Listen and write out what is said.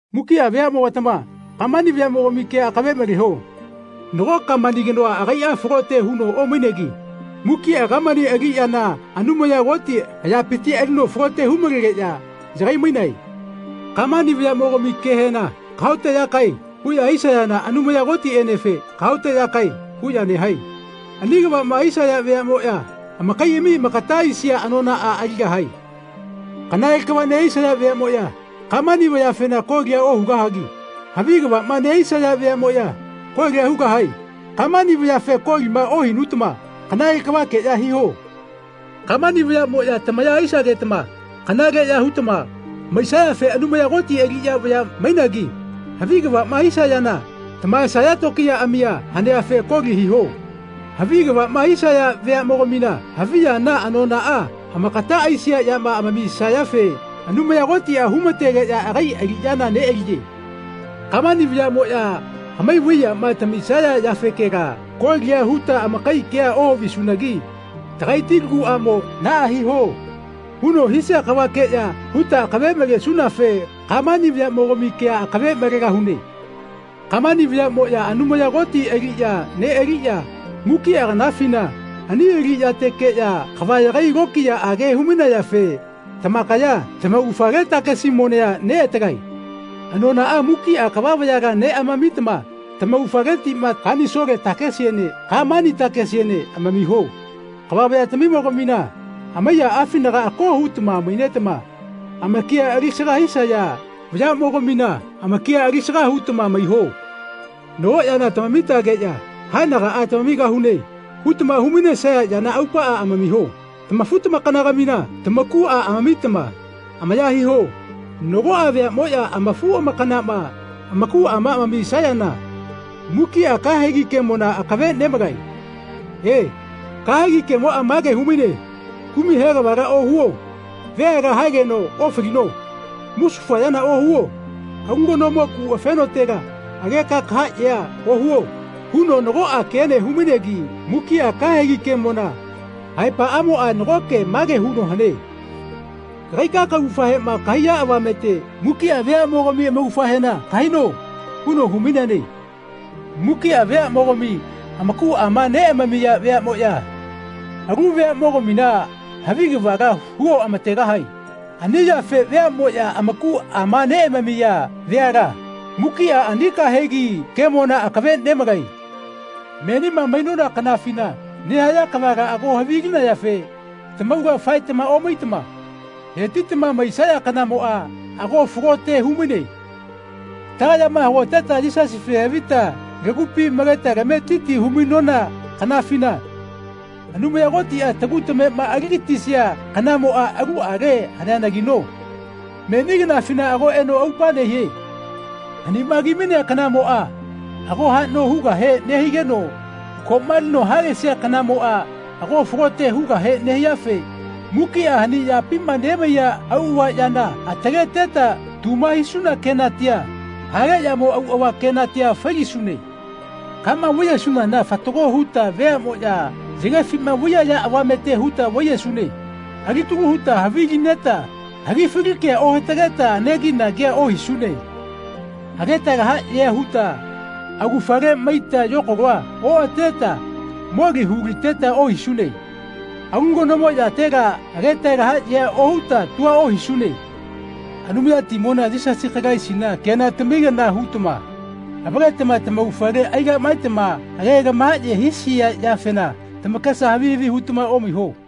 Mukiꞌa veaꞌmogatama Kamani vayaꞌmogami kea akave maleho. Nago Kamani kanoa agaiꞌa falote huno omainegi mukiꞌa Kamani aliꞌyana Anumaya Koti ayapiti alino falote humalegeꞌya yagai-mainae. Kamani vayaꞌmogami kehena “Kahaoteꞌyakae.” huꞌya hisayana Anumaya Kotiꞌenefe “Kahaoteꞌyakae.” huꞌya nehae. Ani kavaꞌma hisaya veaꞌmoꞌya amakaiꞌami amakata aisia anonaꞌa aligahae. Kanale kava nehisaya veaꞌmoꞌya Kamani vayafena kolia ohugahagi havi kavaꞌma nehisaya veaꞌmoꞌya koli hugahae. Kamani vayafe kolima ohinutama kanale kavakeꞌya hiho. Kamani vayaꞌmoꞌya tamaya hisagetama kanaleꞌya hutama maisayafe Anumaya Koti aliꞌya vaya mainagi havi kavaꞌma hisayana tamahaesaya tokiyaꞌamia haneafe koli hiho. Havi kavaꞌma hisaya veaꞌmogamina havi yana anonaꞌa amakata aisia yama amamisayafe Anumaya Kotiꞌa humategeꞌya agai aliꞌyana neꞌaliye. Kamani vayaꞌmoꞌya hamai vai yama tamisaya yafekela kolia huta amakai kea ohavisunagi tagaiti laguꞌamo “Naꞌa hiho.” huno hisia kavakeꞌya huta akave malesunafe Kamani vayaꞌmogami kea akave malegahune. Kamani vayaꞌmoꞌya Anumaya Koti aliꞌya neꞌaliꞌya mukiꞌa kanafina ani aliꞌyatekeꞌya kava yagai lokiyaꞌage humainayafe tamakaya tamaugafale takesi monea neꞌatalae. Anonaꞌa mukiꞌa kava vayala neꞌamamitama tamaugafaletiꞌma kanisole takesiene Kamani takesiene amamiho. Kava vayatamimogamina amaiyaꞌafinaga ako hutama mainetama amakia alisaga hisaya vayaꞌmogamina amakia alisaga hutama maiho. Nago yana tamamitageꞌya “Haenagaꞌa tamamigahune.” hutama humainesaya yana aupaꞌa amamiho. Tamafu-tamakanagamina tamakuꞌa amamitama amaya hiho. Nagoꞌa veaꞌmoꞌya amafu-amakanama amakuꞌama amamisayana mukiꞌa kahegi kemona akave nemalae. E, kahegi kemoꞌa mage humaine, Kumai he kavala ohuo. Veala haegeno ofalino. Musufa yana ohuo. Alu kanomo kuꞌafenotela ageka kahaꞌyea ohuo huno nagoꞌa kene humainegi mukiꞌa kahegi kemona aepaꞌamoꞌa nagoke mage huno hane, kagaika kaugafahema kahaiya avamete mukiꞌa veaꞌmogami amaugafahena kahaino huno humaineane. Mukiꞌa veaꞌmogami amakuꞌama neꞌamamiya veaꞌmoꞌya alu veaꞌmogamina havi kavala huoꞌamategahae. Ani yafe veaꞌmoꞌya amakuꞌama neꞌamamiya veala mukiꞌa ani kahegi kemona akave nemalae. Menima mainona kanafima nehaya kavala ago havilinayafe tamaula faetama omaitama hetitama maisaya kanamoꞌa ago falote humaine. Tagayama hagoteta Yisasife havita lagupi maleta tametiti humainona kanafina Anumaya Kotiꞌa tagu tamema aligatisia kanamoꞌa aluꞌale haneanagino meni kanafina ago eno aupa nehie. Hanima kimainea kanamoꞌa ago haꞌno hugahe nehigeno koꞌma alino halesia kanamoꞌa ago falote hugahe nehiafe mukiꞌa hani yapima nemaiya auꞌava yana ataleteta tuma hisuna kenatia, hale yamo auꞌava kenatia failisune. Kama vaiyesunana fatago huta veaꞌmoꞌya yagefima vaiyaya avamete huta vaiyesune. Alitalu huta havili neta hagifali kea ohatageta anegi-nagia ohisune. Ageta lahaꞌyea huta augafale maita yokalo oꞌateta moli huliteta ohisune. Alu kanomo yatela ageta lahaꞌyea ohuta tua ohisune. Anumayatimona Yisasi Kalaisina kenatami kana hutama avaletama taugafale aigaꞌmaetama age lamahaye hisaya yafena tamakesa havi havi hutama omaiho.